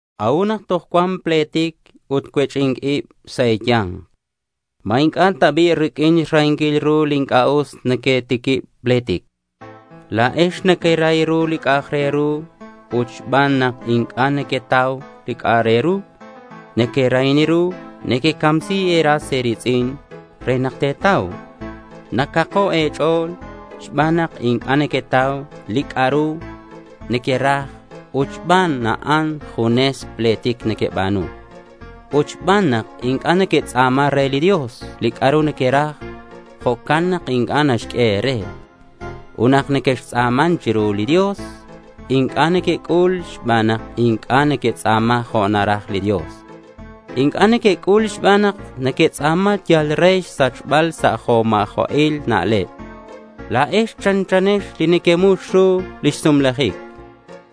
¿C'a'ut nak toj cuan pletic ut cuech'i̱nc ib sa' e̱ya̱nk? ¿Ma inc'a' ta bi' riq'uin xrahinquil ru li inc'a' us nequetiquib pletic? La̱ex nequerahi ru li c'a'ak re ru ut xban nak inc'a' nequetau li c'a'ru nequerahi ru, nequecamsi e̱ras e̱ri̱tz'in re nak te̱tau. Nacako' e̱ch'o̱l xban nak inc'a' nequetau li c'a'ru nequeraj ut xban a'an junes pletic nequeba̱nu. Ut xban nak inc'a' nequetz'a̱ma re li Dios li c'a'ru nequeraj, jo'can nak inc'a' naxq'ue e̱re. Ut nak nequextz'a̱man chiru li Dios, inc'a' nequec'ul xban nak inc'a' nequetz'a̱ma jo' naraj li Dios. Inc'a' nequec'ul xban nak nequetz'a̱ma yal re xsachbal sa' li jo' ma̱jo'il na'leb. La̱ex chanchanex li neque'xmux ru lix sumlajic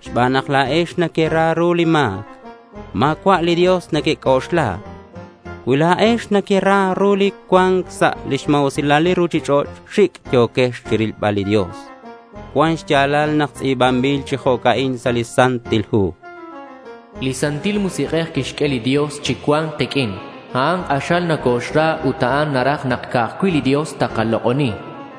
xban nak la̱ex nequera ru li ma̱c. Ma̱cua' li Dios nequec'oxla. Cui la̱ex nequera ru li cua̱nc sa' lix ma̱usilal li ruchich'och' xic' yo̱quex chirilbal li Dios. Cuan xya̱lal nak tz'i̱banbil chi jo'ca'in sa' li Santil Hu: Li Santil Musik'ej li quixq'ue li Dios chi cua̱nc kiq'uin, a'an k'axal nocoxra ut a'an naraj nak ca'aj cui' li Dios takalok'oni.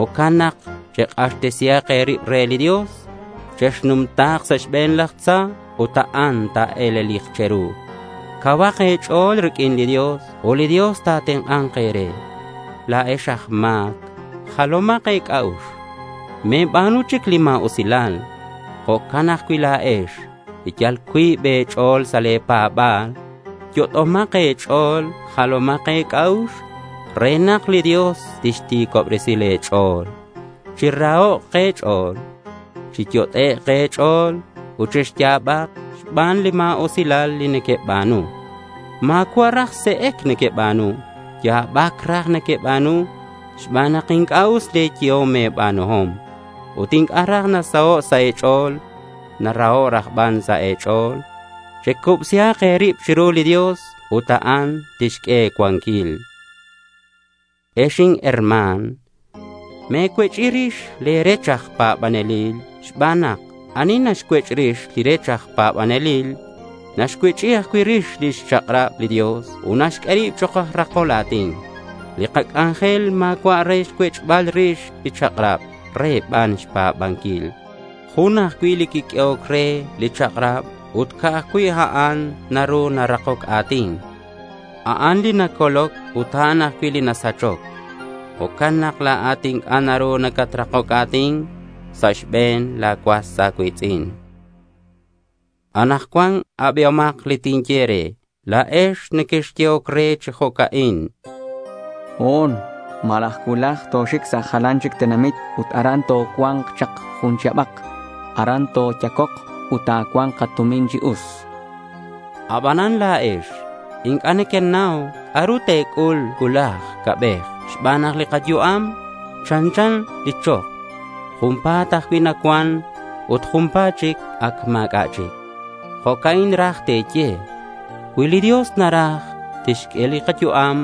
Jo'can nak chek'axtesihak e̱rib re li Dios. Chexnumta̱k sa' xbe̱n laj tza ut a'an ta̱e̱lelik che̱ru. Cauhak e̱ch'o̱l riq'uin li Dios ut li Dios ta̱tenk'a̱nk e̱re. La̱ex aj ma̱c, jalomak e̱c'a'ux. Me̱ba̱nu chic li ma̱usilal. Jo'can ajcui' la̱ex li yal cuib e̱ch'o̱l sa' le̱ pa̱ba̱l, yot'omak e̱ch'o̱l ut jalomak e̱c'a'ux re nak li Dios tixti̱cobresi le̱ ch'o̱l. Chirahok' e̱ch'o̱l, chiyot'ek' e̱ch'o̱l ut chexya̱bak xban li ma̱usilal li nequeba̱nu. Ma̱cua' raj se'ec nequeba̱nu; ya̱bac raj nequeba̱nu xban nak inc'a' us le̱ yehom e̱ba̱nuhom. Ut inc'a' raj nasaho' sa' e̱ch'o̱l. Naraho' raj ban sa' e̱ch'o̱l. Checubsihak e̱rib chiru li Dios ut a'an tixq'ue e̱cuanquil. Ex inherma̱n, me̱cuech'i rix le̱ rech aj pa̱banelil xban nak ani naxcuech'i rix li rech aj pa̱banelil naxcuech'i ajcui' rix lix chak'rab li Dios ut naxq'ue rib chok' aj rakol a̱tin. Li kac'anjel ma̱cua' re xcuech'bal rix li chak'rab; re ban xpa̱banquil. Jun ajcui' li quiq'uehoc re li chak'rab ut ca'aj cui' a'an naru narakoc a̱tin. A'an li nacoloc ut a'an ajcui' li nasachoc. Jo'can nak la̱at inc'a' naru nacatrakoc a̱tin sa' xbe̱n la̱ cuas a̱cui̱tz'in. Anakcuan abihomak li tinye e̱re la̱ex li nequexyehoc re chi jo'ca'in: Ho̱n malaj cuulaj toxic sa' jalan chic tenamit ut aran tocua̱nk chak jun chihabak. Aran toyacok ut ta̱cua̱nk katumin chi us. Aban la̱ex inc'a' nequenau c'a'ru te̱c'ul cuulaj ca'bej xban nak li kayu'am chanchan li chok. Junpa̱t ajcui' nacuan ut junpa̱t chic ac ma̱c'a' chic. Jo'ca'in raj te̱ye: Cui li Dios naraj, tixq'ue kayu'am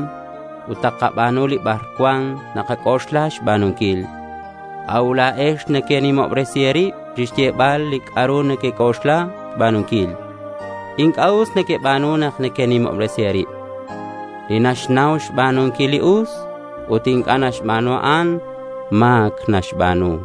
ut takaba̱nu li bar cuan nakac'oxla xba̱nunquil. A'ut la̱ex nequenimobresi e̱rib chixyebal li c'a'ru nequec'oxla xba̱nunquil. Inc'a' us nequeba̱nu nak nequenimobresi e̱rib. Li naxnau xba̱nunquil li us, ut inc'a' naxba̱nu, a'an ma̱c naxba̱nu.